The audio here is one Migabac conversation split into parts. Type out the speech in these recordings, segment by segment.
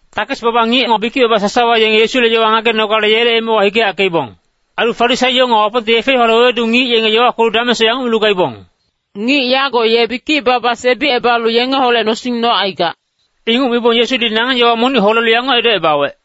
Takes-baba ngic nga bikic-baba sasawa yenge Yesule yowa ngagenogale yele emewa hikeyackeibong. Ailu Farisaio nga Wapongte yefe-yowale wewedu ngic yenge yowa kwelu damengsoc yanguc milu gaibong, “Ngic yago ye bikic-baba sebicebalu yengeholec nosing nocaigac.” Inguc mibong Yesudi nangeng yowa monic holelu yanguc edocebawec,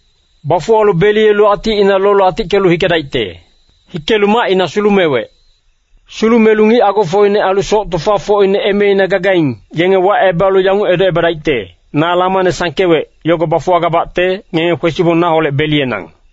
Bafuwalu beliyelu aticina lolu atickelu hikedaicte. Hikelu macina sulumewec. Sulumelu ngic agofocine ailu soc tofafocine emeina gagaing, yenge wacebalu yanguc edocebadaicte, ‘Na lamane sangkewec, yogo bafuwagabacte, ngenge kwesibong naholec beliyenang.’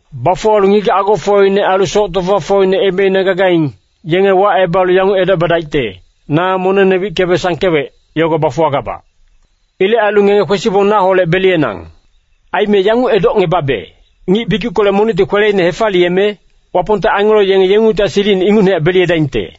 Bafuwalu ngigac agofocine ailu soc tofafocine emeina gagaing, yenge wacebalu yanguc edocebadaicte, ‘Na monengne wickebe sangkewec, yogo bafuwagabac. Ilec ailu ngenge kwesibong naholec beliyenang.’ Aime yanguc edocngebabe, ngic bikickolec monicti kweleine hefaliyeme, Wapongte angelo yenge yengungtihac silicine ingucnehac beliyedaingte.”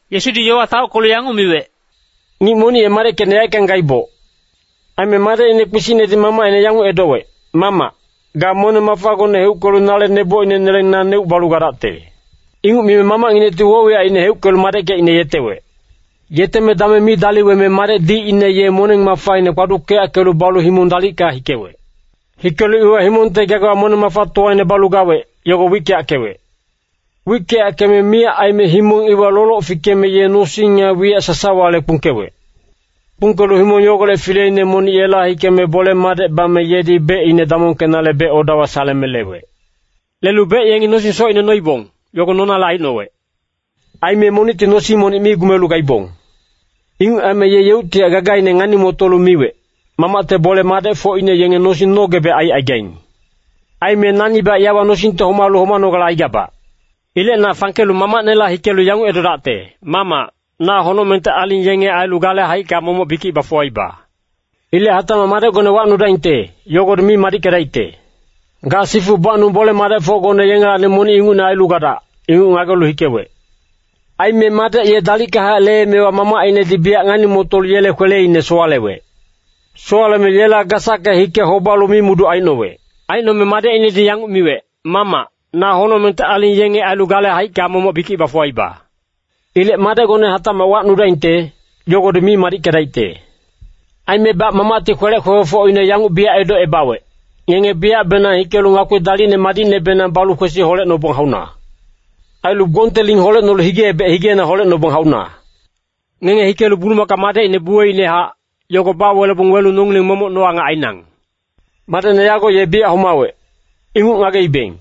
Yesudi yowa taockelu yanguc miwec, “Ngic monic ye madeckecine yaeckang gaiboc. Aime madecine kpisicnedi mamacine yanguc edowec, ‘Mamac, ga moneng-mafa gocne heuckelu nale nebocine neleng naneuc balu gadacte.’ Inguc mime mamacnginecti woc-wiyacine heuckelu madeckecine yetewec. “Yeteme dameng mi daliweme madec dicine ye moneng-mafaine kpaduckeyackelu balu himong dalicka hikewec. Hikelu iwa himongte gagawa moneng-mafatowaine balu gawec, yogo wickeyackewec. Wickeyackeme miyac aime himong iwa loloc fikeme ye nosing nga wiyac sasawale kpungkewec. Kpungkelu himong yogolec fileine monic yela hikeme bole-madec bame yedi becine damongkenale bec-odawa saleme lewec. Lelu bec yengi nosing socine noibong, yogo nonale aicnowec. Aime monicti nosing monic mi gumelu gaibong. “Inguc aime ye yeuctihac gagaine ngani-motolu miwec, ‘Mamacte bole-madecfocine yenge nosing nogebec aicaigaing. Aime nanibac yawa nosingte homalu homanogale aigabac. Ilec na fangkelu mamacnela hikelu yanguc edodacte, “Mamac, na honocmengte aling yenge ailu gale haicka momoc bikic bafuwaiba. Ilec hatacmac madecgone wacnudaingte, yogodi mi madickedaicte. Ga sifu bacnung bole-madecfocgone yengelacni monic ingucne ailu gadac,” ’ inguc ngagelu hikewec. “Aime madec ye dalickahac leemewa mamacinedi biyac ngani-motolu yele kweleine sowalewec. Sowaleme yela gasacke hike hobalu mimuduc aicnowec. Aicnome madecinedi yanguc miwec, ‘Mamac, na honocmengte aling yenge ailu gale haicka momoc bikic bafuwaiba. Ilec madecgone hatacmac wacnudaingte, yogodi mi madickedaicte.’ “Aimebac mamacti kwelec kwekwefocine yanguc biyac edocebawec, ‘Ngenge biyacbenang hikelu ngakpi dalicne madicnebenang balu kwesi holecnobong hauna. Ailu gbongte ling holecnolu hige-ebec higeina holecnobong hauna. Ngenge hikelu bulumaka madecine buweicnehac, yogo bawelebong welu nongileng momoc no-angac ainang. Madecne yago ye biyac homawec, inguc ngageibeng.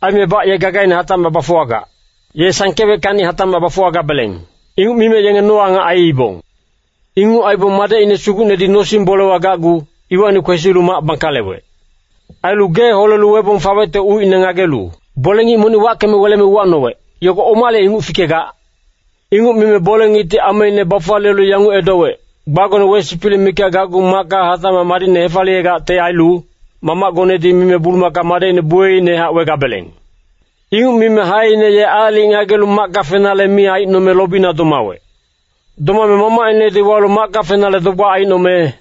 Aimebac ye gagaine hatacmac bafuwagac. Ye sangkeweckacni hatacmac bafuwagabeleng.’ Inguc mime yenge no-angac aiibong. “Inguc aibong madecine sugucnedi nosing-bolewa gacgu, iwacni kwesilu mac bangkalewec. Ailu gee holelu webong fawecte ucine ngagelu bole-ngic monic wackeme weleme uwacnowec, ‘Yogo omale inguc fikegac?’ “Inguc mime bole-ngicti ameine bafaliyelu yanguc edowec, ‘Gbagone wesipilic mikac gacgu macka hatacmac madicne hefaliyegacte ailu, mamacgonedi mime bulumaka madecine buweicnehac wegabeleng.’ “Inguc mime haeine ye aalic ngagelu macka fenale mi aicnome lobina domawec. Domame mamacinedi walu macka fenale dogbac aicnome,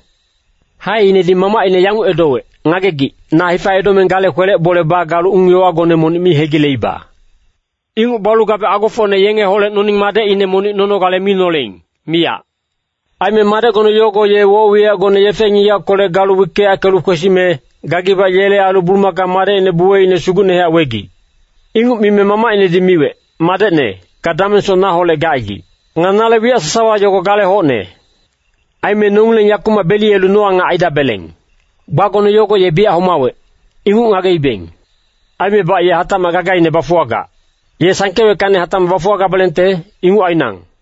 haeinedi mamacine yanguc edowec, ‘Ngagegic, na hifa edomeng gale kwelec bole bagalu ung-yowagone monic mi hegileiba. Inguc balu gabe agofocne yengeholec noning madecine monic nonogale mi noleing, miyac. Aime madecgone yogo ye woc-wiyacgone yefe-ngigackolec galu wickeyackelu kwesime, gagibac yele ailu bulumaka madecine buweicne sugucnehac wegic.’ “Inguc mime mamacinedi miwec, ‘Madecne, ga damengsoc naholec gacaigic. Nga nale wiyac sasawa yogo gale hocne. Aime nongileng yakumac beliyelu no-angac aidabeleng. Gbagone yogo ye biyac homawec, inguc ngageibeng. Aimebac ye hatacmac gagaine bafuwagac. Ye sangkeweckacni hatacmac bafuwagabelengte, inguc ainang.’”